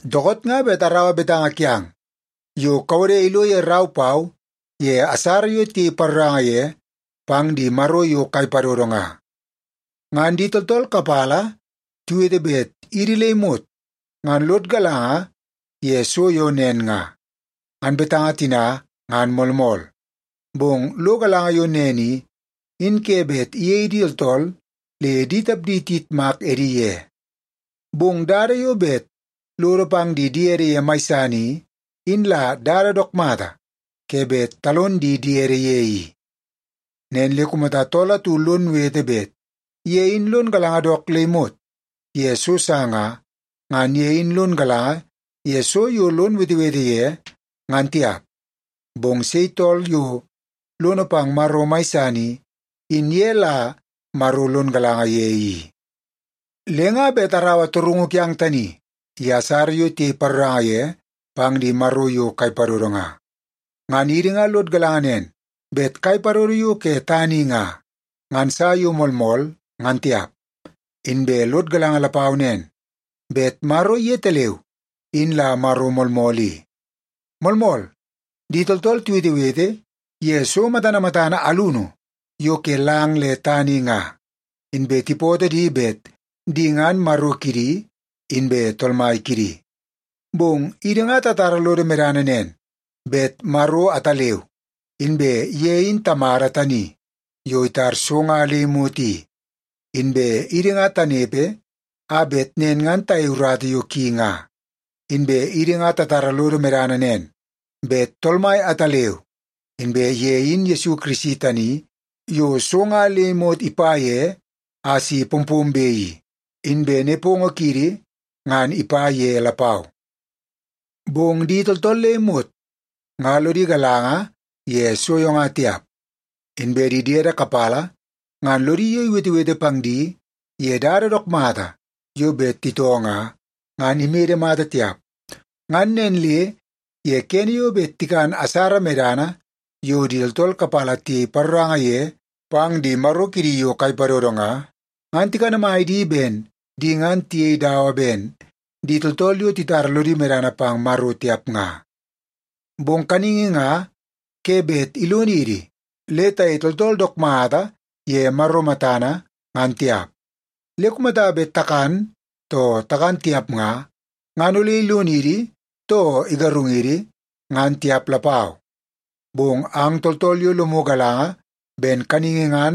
Dookoot nga bet araua betanga kiang yo kawode ilo ye rau pau ye asara yo tiyei paroranga ye pang di maro yo kai padodo nga. Ngan di tooltool kapala tiwete bet idi le imot ngan lod galanga ye so yo nen nga, ngan betanga tina ngan moolmool. Bong lo galanga yo nen i, in ke bet iyei di tooltool le di tapdi tiyitmak edi ye. Bong dada yo bet lodo pang di diede ye mai san i, in la dada dook mata ke bet talon di diede ye i. Nen le kumata tool atu lon wete bet ye in lon galanga dook le imot ye so sa nga, ngan ye in lon galanga ye so yo lon wetewete ye, ngan tiap. Bong sei tool yo lono pang Maro mai san i, in ye la Maro lon galanga ye i. Le nga bet araua torungu kiang tani ye asara yo tiyei paroranga ye pang di maro yo kai padodo nga. Ngan idi nga lod galanga nen bet kai padodo yo ke tana i nga, ngan sa yo moolmool ngan tiap. Inbe lod galanga lapau nen bet Maro yetaleu in la Maro moolmool i. Moolmool, di tooltool tiwetewete ye so matana matana alunu yo ke lang le tana i nga, inbe tipootoo di bet di ngan “maro” kidi inbe “tool mai” kidi. Bong idi nga tatara lodo medana nen, bet Maro ataleu, inbe ye in Tamada tani yo itar so nga le imot i. Inbe idi nga tanepe a bet nen ngan tayei urata yo ki nga. Inbe idi nga tatara lodo medana nen, bet Tool Mai ataleu, inbe ye in Yesu Kirisi tani yo so nga le imot ipa ye a si pompombe i. Inbe nepongo kiidi ngan ipa ye lapau. Bong di tooltool le imot nga lodi galanga ye so yo nga tiap. Inbe di diede kapala ngan lodi yo iwetewete pang di ye dada dook mata yo bet titoo nga, ngan imede mata tiap. Ngan nen le ye kene yo bet tikan asara medana yo di tooltool kapala tiyei paroranga ye pang di maro kidi yo kai padodo nga, ngan tikanamai di ben di ngan tiyei dada dawa ben di tooltool yo titara lodi medana pang Maro tiap nga. Bong kaningi nga ke bet ilonidi le tayei tooltool dook mata ye Maro matana ngan tiap. Le kumata bet takan too takan tiap nga, ngan ole ilonidi too igarungidi, ngan tiap lapau. Bong ang tooltool yo lomu galanga ben kaningi ngan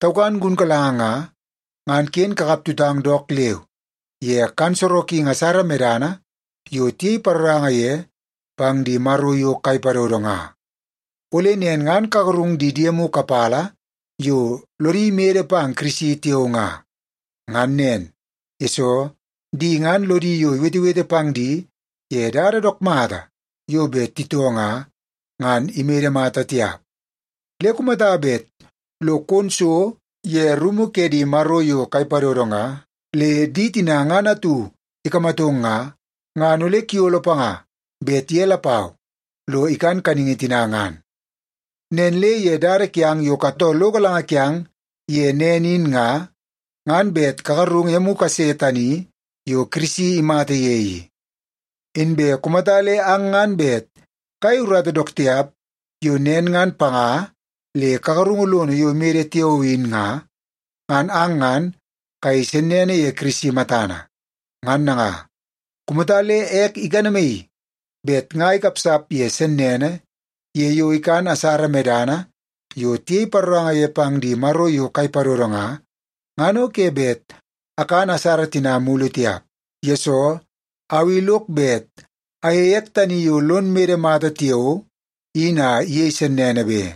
taukan gunkalanga nga, ngan ken kakap tutang dook leu ye kan sorokingi asara medana yo tiyei paroranga ye pang di maro yo kai padodo nga. Ole nen ngan kagarung di diemu kapala yo lodi mede pang Kirisi tiao nga. Ngan nen, yesoo di ngan lodi yo iwetewete pang di ye dada dook mata yo bet titoo nga, ngan imede mata tiap. Le kumata bet lo kon so ye rumu ke di maro yo kai padodo nga, le di tina ngan atu ikamatong nga, ngan ole kuyolo panga bet ye lapau lo ikan kaningi tina ngan. Nen le ye dada kiang yo katoo lo galanga kiang ye nen in nga, ngan bet kagarungu emu kase tani yo Kirisi imata ye i. Inbe kumata le ang ngan bet kayei urata dook tiap yo nen ngan panga le kagarungu lono yo imede tiao in nga, ngan ang ngan kayei sennene ye Kirisi matana. Ngan nanga, kumata le ek ikanamaii bet nga ikapsap ye sennene ye yo ikan asara medana yo tiyei paroranga ye pang di maro yo kai padodo nga, ngan o ke bet akan asara tina mulu tiap. Yesoo, au i lok bet ayeie ek tani yo lon mede mata tiao in a iyei sennene be.